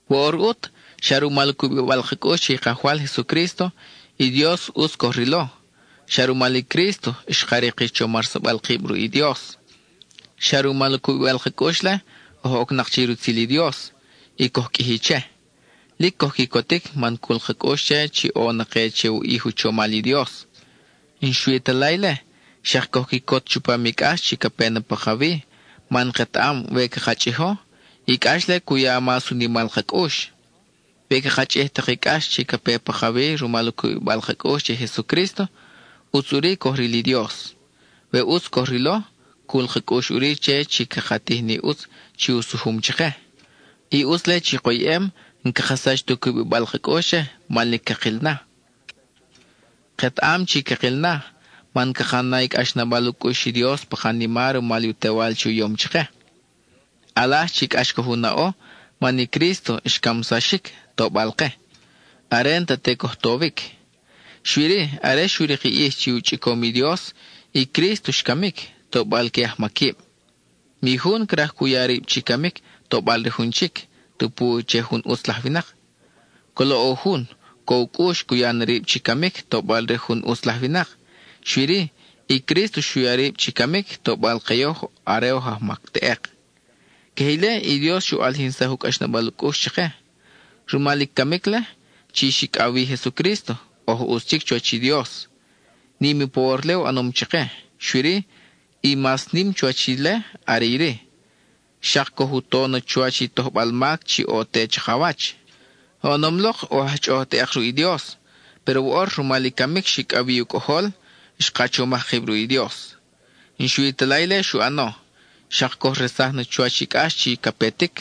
Woʼor ʼut, xa rumal u cubibal ka cʼux che i Kajwal Jesucrísto, i Dios ʼutz coj rilo; xa rumal i Crísto xka rik i chomarsabal kib ruʼ i Dios. Xa rumal u cubibal ka cʼux-le, oj ocnak che i rutzil i Dios, y coj qʼuiji che. Lic coj quicotic man cul ka cʼux che chi ʼo na ke che u ʼij u chomal i Dios. N-xui ta la ile, xak coj quicot chupam i cʼax chi ca pe pakawi, man ketaʼam we caka chʼijo, i cʼax-le cu ya mas u nimal ka cʼux. We caka chʼij tak i cʼax chi ca pe pakawi rumal u cubibal ka cʼux che i Jesucrísto, ʼutz ʼuri coj ril i Dios. We ʼutz coj rilo, cul ka cʼux ʼuri che chi caka tij ni ʼutz chi u sujum chake. I ʼutz-le chi koyʼem, n-caka sach ta u cubibal ka cʼux che, man lic cakil na. Ketaʼam chi cakil na, man caka na i cʼaxnabal u cʼux i Dios pa kanima rumal u Tewal chi u yom chake. ʼAlaj chi cʼax coj u naʼo, man i Crísto xcamsaxic tobal ke, are n-ta te coj towic. Xui-ri, are xu rik i ʼij chi u chʼicom i Dios, i Crísto xcamic, tobal que ajmaquib. Mi jun craj cu ya rib chi camic, tobal re jun chic, tupu che jun ʼutz laj winak. Colo ʼo jun, co u cʼux, cu ya na rib chi camic tobal re jun ʼutz laj winak. Xui-ri, i Crísto xu ya rib chi camic, tobal ke yoj are oj ajmac teʼek. Queje ile, i Dios xu ʼalijinsaj u cʼaxnabal u cʼux chake. Rumal i camic-le chi xicʼaw wi Jesucrísto, oj ʼutz chic chuwach i Dios. Nim i pawor-le u ʼanom chake, xui-ri, i mas nim chuwach ile are iri: xak coj u to na chuwach i tojbal mac chi ʼo te chakawach. Oʼonom lok oj aj chʼoʼoj teʼek ruʼ i Dios, péro woʼor rumal i camic xicʼaw wi i u Cʼojol, xka chomaj kib ruʼ i Dios. N-xui ta la ile xu ʼano, xak coj resaj na chuwach i cʼax chi ca petic,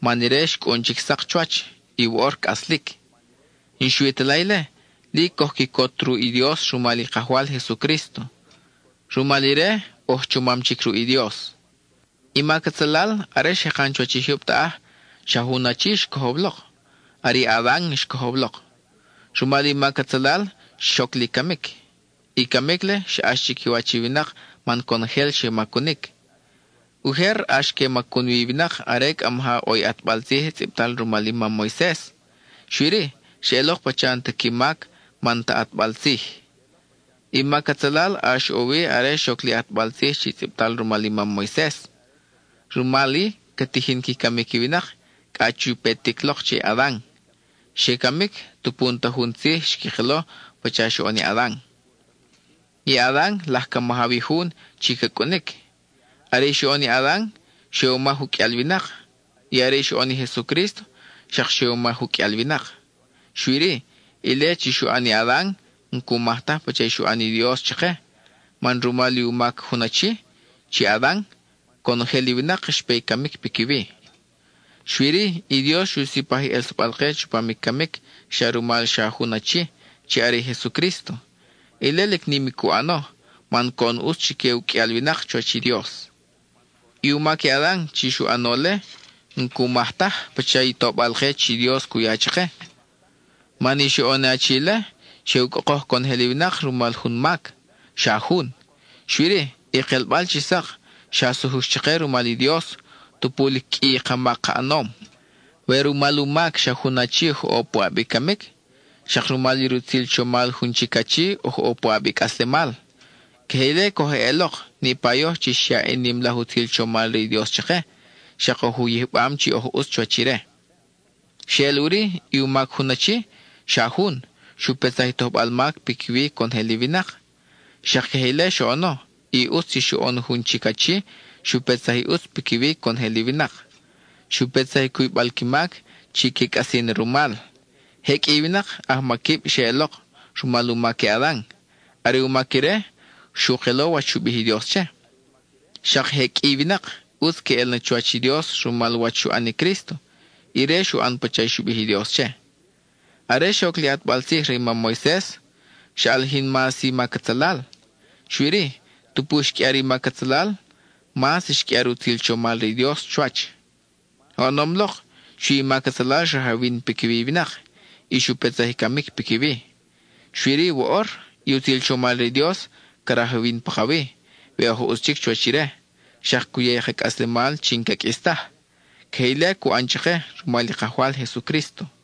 man ire xcʼun chic sak chuwach, y woʼor cʼaslic. Y n-xui ta la ile, lic coj quicot ruʼ i Dios rumal i Kajwal Jesucrísto. Rumal ire, oj chomam chic ruʼ i Dios. I mac atzalal, are xjekan chuwach i jyub taʼaj, xa jun achi xcojow lok. (Are i Adan xcojow lok.) Rumal i mac atzalal xoc li camic. I camic-le xa ʼax chiquiwach i winak man conojel xe macunic. Ujer ʼax que macun wi i winak are cʼa maja ʼo i ʼatbal tzij tzʼibtal rumal i mam Moises. Xui-ri, xeʼelok pacha n-ta qui mac, man n-ta ʼatbal tzij. I mac atzalal ʼax ʼo wi are xoc li ʼatbal tzij chi tzʼibtal rumal i mam Moises. Rumal-i, ca tijin qui camic i winak cʼa chu petic lok che i Adan. Xe camic, tupu n-ta jun tzij xqui kelo pacha xoʼon i Adan. I Adan laj ca majaw i jun chi ca cʼunic. (Are i xoʼon i Adan, xe u maj u qʼuial winak; y are xoʼon i Jesucrísto, xak xe u maj u qʼuial winak.) Xui-ri, ile chi xu ʼan i Adan n-cu maj taj pacha i xu ʼan i Dios chake, man rumal i u mac jun achi (chi Adan), conojel i winak xpe i camic piquiwi. Xui-ri, i Dios xu sipaj i ʼelsabal-ke chupam i camic xak rumal xa jun achi, chi are i Jesucrísto; ile lic nim i cu ʼano, man coʼon ʼutz chique u qʼuial winak chuwach i Dios. I u mac i Adan chi xu ʼano-le n-cu maj taj pacha i tobal-ke chi Dios cu ya chake, man i xoʼon i achi-le, xe u cʼokoj conojel i winak rumal jun mac, xa jun, xui-ri, i kelbal chi sak xa sujux chake rumal i Dios, tupu lic qʼui i ka mac ka ʼanom. We rumal u mac xa jun achi oj ʼo puʼab i camic, xak rumal i rutzil chomal jun chic achi oj ʼo puʼab i cʼaslemal. Queje ile coj eʼelok, niʼpa yoj chi xyaʼ i nim laj utzil chomal re i Dios chake, xak oj u yijbam chi oj ʼutz chuwach ire. Xeʼel ʼuri, i u mac jun achi, xa jun, xu petsaj i tojbal mac piquiwi conojel i winak. Xak queje ile xoʼono i ʼutz chi xoʼon jun chic achi xu petsaj i ʼutz piquiwi conojel i winak. Xu petsaj i cuybal qui mac, chi que cʼasi na rumal. Je qʼui i winak, ajmaquib xeʼelok, rumal u mac i Adan; are u mac ire, xu kelo wach xu bij i Dios che. Xak je qʼui i winak, ʼutz queʼel na chuwach i Dios rumal wach xu ʼan i Crísto; ire xu ʼan pacha xu bij i Dios che. Are xoc li ʼatbal tzij re i mam Moises, xa ʼalijin mas i mac atzalal. Xui-ri, tupu xqʼuiar i mac atzalal, mas xqʼuiar i utzil chomal re i Dios chuwach. Oʼonom lok, xui i mac atzalal xrajawin piquiwi i winak, y xu petsaj i camic piquiwi. Xui-ri woʼor, i utzil chomal re i Dios ca rajawin pakawi, we oj ʼutz chic chuwach ire; xak cu ya i ka cʼaslemal chi n-ca qʼuis taj. Queje ile cu ʼan chake rumal i Kajwal Jesucrísto.